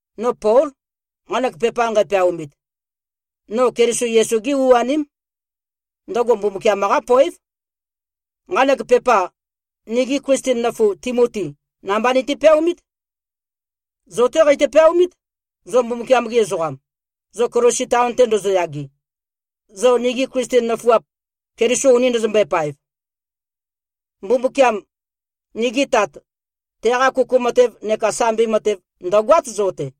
No Pól, nqanek pepa nqæpeaomit. No Keliso Yesu-gé u-aném. Ndøgo Mbumbukiam-qá poév. Nqanek pepa, nigi Klisten nøfu Timotí namba niti-peaomít. Zo-té qeitø-peaomít, zo Mbumbukiam-gi ezoqam, zo Kolosi taon-te ndozoyage, zo nigi Klisten nøfuap, Keliso uni ndøzømbøe-paev. Mbumbukiam, nigi Tat, teqa kuku matev neka sambi matev, ndø̀goát zo-te.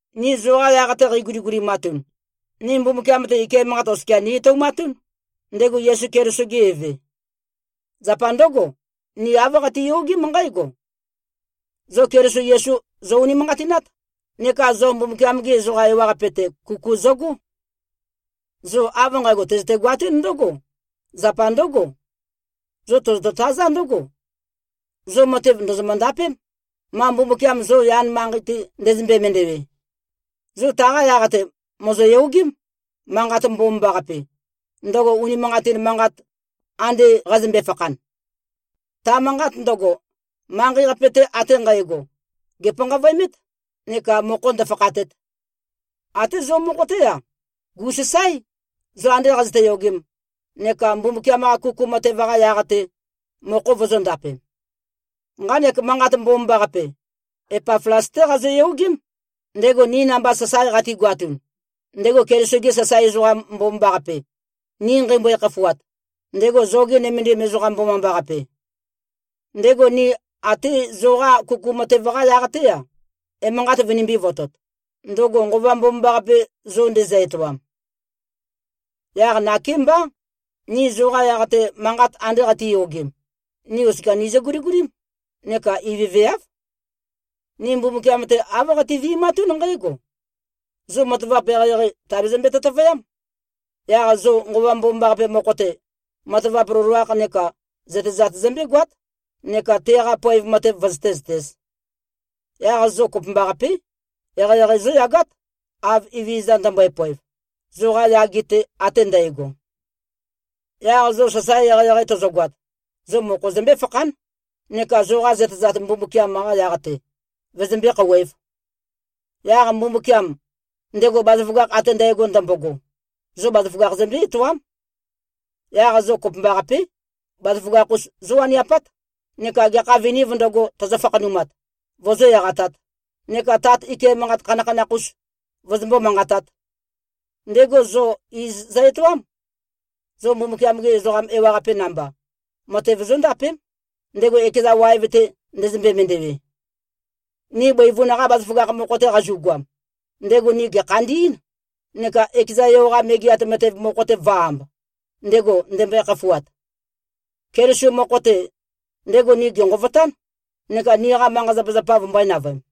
Ni zoqa yaq-te qeiguligulimatun, ni Mbumbukiam-te, ike manqat oskia ni-etoumatún, ndego Yesu Keliso-ge Eve. Zapa ndǿgo, ni āv qatiyogém nqǽgo: Zo Keliso Yesu zo-unimanqatinát, neka zo Mbumbukiam-gi ezoqa ewaqape-te, kuku zøgó. Zo av nqægo, tøzøte-goatún ndǿgo, zapa ndǿgo: Zo tozoto-tazá ndǿgo: Zo matev, ndòzomø-ndapém, ma Mbumbukiam zo yan manqei-te ndezømbe-mendewe. Zo taqa yaq-te, mòzoyogém, Manqat Mbomambaqape, ndøgo unimanqatin manqat, ande qazømbe-fakhan. Ta manqat ndøgo, manqei-qape-te ate nqægo gèpanqavøemét, neka mokho ndø̄fākhātēt. Até zo mokho-té-a, gu꞉sasáe, zo ande qazøte-yogem, neka Mbumbukiam-qa kuku matev-qa yaq-te, mokho vozōndapem. Nqanek Manqat Mbomambaqape, Epaflas-té qazoyogém, ndego ni namba sasae qatigoatun, ndego Keliso-ge sasae ezoqam mbomambaqape, ni nqeimbøe-khafuat, ndego zoge nømendim ezoqam mbomambaqape. Ndego ni até zoqa kuku matev-qa yaq-té-a, emanqat vønimbī-votot, ndøgo Nqova Mbomambaqape, zo ndezø-etoam. Yaq nakémbá, ni zoqa yaq-te, manqat ande qatiyogem, ni oskia nizø-guligulím, neka ivøveáv. Ni Mbumbukiam-te, āv qati-vi꞉matún nqǽgo: Zo matavap eqeieqei, tàbezømbe-tøtøvøyám. Yaq zo Nqova Mbomambaqape mokho-te, matavap loloakh neka zøtezat zømbégoát, neka teqa poev matev vøzøté-zøtēz. Yaq zo kopømbaqapé, eqeieqei zóyagát, av Evezøza ndømbøe-poev, zoqa yage-te ate ndægo. Yaq zo sasae eqeieqei tozogoat, zo mokho zømbé-fakhán, neka zoqa zøtezat, Mbumbukiam-qa yaq-te, vøzømbé-khouwēv. Yaq Mbumbukiam, ndego bazaføgakh ate ndægo ndømbogo, zo bazaføgakh zømbé-etoám. Yaq zo kopømbaqapé, bazaføgakh-us zówaniapát neka gekha vinīv ndøgo, tøzø-fakhanumat, vozó-eqatāt, neka Tat ike manqat khanakhanakh-us vozombó-manqatāt. Ndego zo iz zø-etoám. Zo Mbumbukiam-gi ezoqa ewaqape namba, matev zóndapém, ndego ekeza waev-te, ndezømbe-mendewe. Ni bøivun-qa bazaføgakh mokho-te qazu꞉goam, ndego ni gèkhandí꞉n, neka ekeza Yo-qa megeat matev mokho-te vø̄-amb, ndego ndembøe-khafuat. Keliso mokho-te, ndego ni gènqovotán, neka niqa manqa-zapazapa vømbø̄e-navøem.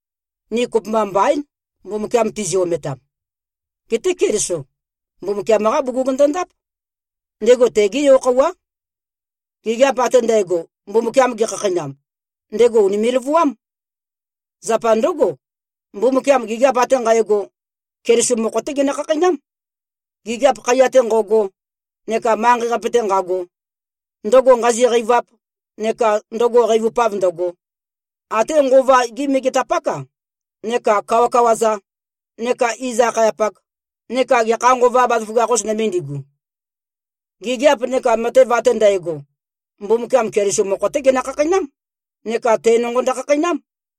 Ni kopømba mbaín, Mbumbukiam tizi-ometam. Geté Keliso, Mbumbukiam-qá bugug ndondáp. Ndego tegé yo-khøuwá. Gigiap ate ndægo, Mbumbukiam gekhakheinam, ndego ùnime꞉-løvuám. Zapa ndǿgo, Mbumbukiam gigiap ate nqægo, Keliso mokho-té genø-khakheinám, gigiap khaiya-te nqo꞉go, neka manqei-qape-te nqago, ndøgo nqazi-qeivap neka ndøgo qeivupav ndøgo, até nqova-gi megetapák-a neka kawakawa-za neka iz-akhayapak, neka gekha nqova bazaføgakh-us nøme ndigu. Gigiap neka matev ate ndægo, Mbumbukiam Keliso mokho-té genø-khakheinám, neka te nonqo ndøkhakheinám.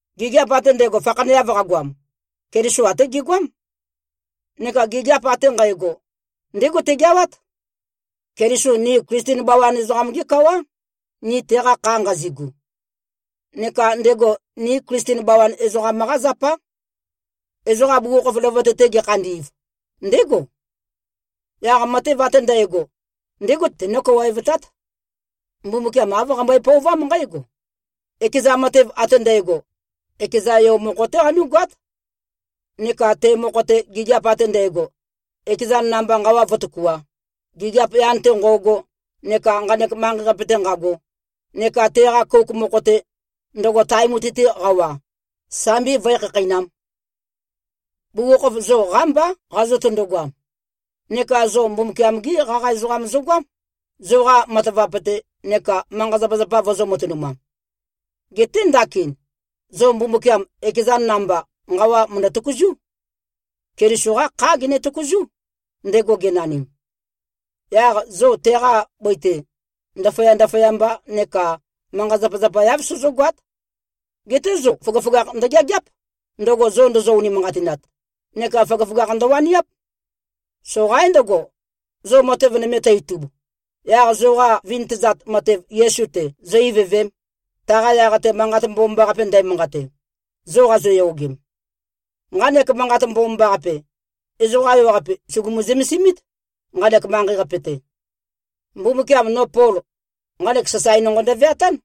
Gigiap ate ndægo fakhaneav qagoam, Keliso até gegoám. Neka gigiap ate nqægo, ndégo tegeawát. Keliso ni Klisten bawan ezoqam-gé kawá, ni teqa kha nqazigu. Neka ndego ni Klisten bawan ezoqam-qá zapá. Ezoqa bugukhokhof løvøte-te gekhandi꞉v, ndégo. Yaq matev ate ndægo, ndégo tenó-kawaevtát. Mbumbukiam āv qambøe-pøovám nqǽgo: Ekeza matev ate ndægo, ekeza Yo mokho-té qanú꞉goát, neka te mokho-te, gigiap ate ndægo, ekezan namba nqawa vǿtøkuā, gigiap yan-te nqo꞉go neka nqanek manqei-qape-te nqago, neka teqa kouk mokho-te, ndøgo tae mutui-te qawa, sambi vǿe-khakheinām. Bugukhokhof, zo qámbá qazøtøndo-goam. Neka zo Mbumbukiam-gí qaqa ezoqam zogoám, zoqa matavap-te, neka manqa-zapazapa vozō-matønumam. Geté ndakin, zo Mbumbukiam, ekezan namba, nqawa mø̀ndø-tøkuzú. Keliso-qá khá gene-tøkuzú, ndego genanim. Yaq zo teqa bøi-te, ndaføya-ndaføyamba neka manqa-zapazapa-yav sozógoát. Geté zo føgøføgakh ndøgeageáp, ndøgo zo ndozo-unimanqatinat, neka føgøføgakh ndøwaniáp. Soqaín ndøgo, zo matev nøme tø-itub, yaq zoqa vintøzat matev Yesu-te zō-ivøvēm, taqa yaq-te Manqat Mbomambaqape ndæmanqate, zo qazoyogem. Nqanek Manqat Mbomambaqape, ezoqa ewaqape sùgumu-zømesimít, nqanek manqei-qape-te. Mbumbukiam no Pol, nqanek sasae nonqo ndøveatán.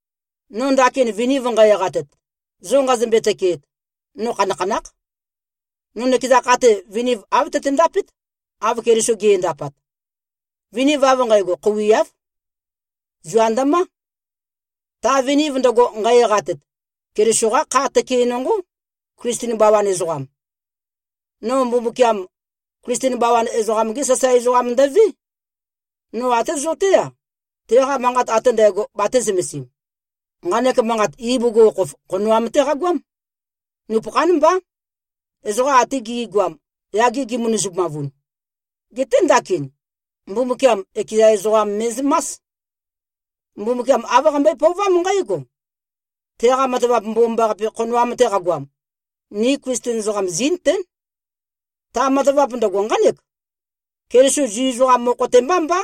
No ndakin viniv nqæ-eqatet, zo nqazømbe-tøkeet, no khanakhanákh. No nøkeza kha-te, viniv āv tøtendapét, av Keliso ge꞉ndapat. Viniv av nqægo khouiáv. Zua ndømá. Ta viniv ndøgo, nqæ-eqatet, Keliso-qá kha tøke nonqó, Klisten bawan ezoqam. No Mbumbukiam, Klisten bawan ezoqam-gé sasae ezoqam ndøvé. No até zo-té-a, teqa manqat ate ndægo batē-zømesim. Nqanek manqat, ibugukhokhof khonoam-té qagoám, nupøkhán mbá, ezoqa ate gi꞉goam, yage gimønøzumavun. Geté ndakin, Mbumbukiam ekeza ezoqam me꞉zømás. Mbumbukiam āv qambøe-pøovám nqǽgo: Teqa matavap mbomambaqape, khonoam-te qagoam, ni Klisten ezoqam, zí꞉nøtén. Ta matavap ndøgo nqánek: Keliso Zu ezoqam mokho-te mbá mbá,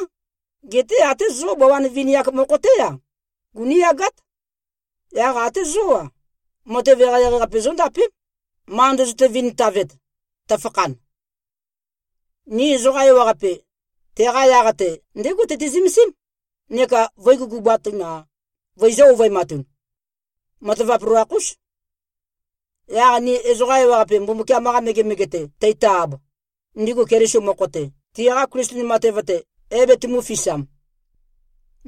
geté até zó bawan vini-ak mokho-té-a, gunú꞉yagát. Yaq até zo-a, matev eqeieqei-qape zóndapém, ma ndøzøte-vintavet, tøfakhan. Ni ezoqa ewaqape, teqa yaq-te ndégo tøti-zømesím, neka vø̄i-gugubatun-a, vøizø̄-ovøematun. Matavap loloakh-ús. Yaq ni ezoqa ewaqape Mbumbukiam-qa megemege-te teito-ab, ndigu Keliso mokho-te, tiqa Klisten matev-te é-betømū-fisam.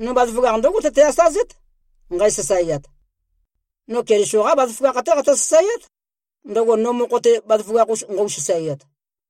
No bazaføgakh ndǿgo tøte-asazét, nqæ-sasaeat. No Keliso-qá bazaføgakh-té qatø-sasaeát, ndøgo no mokho-te bazaføgakh-us nqøu-sasaeat.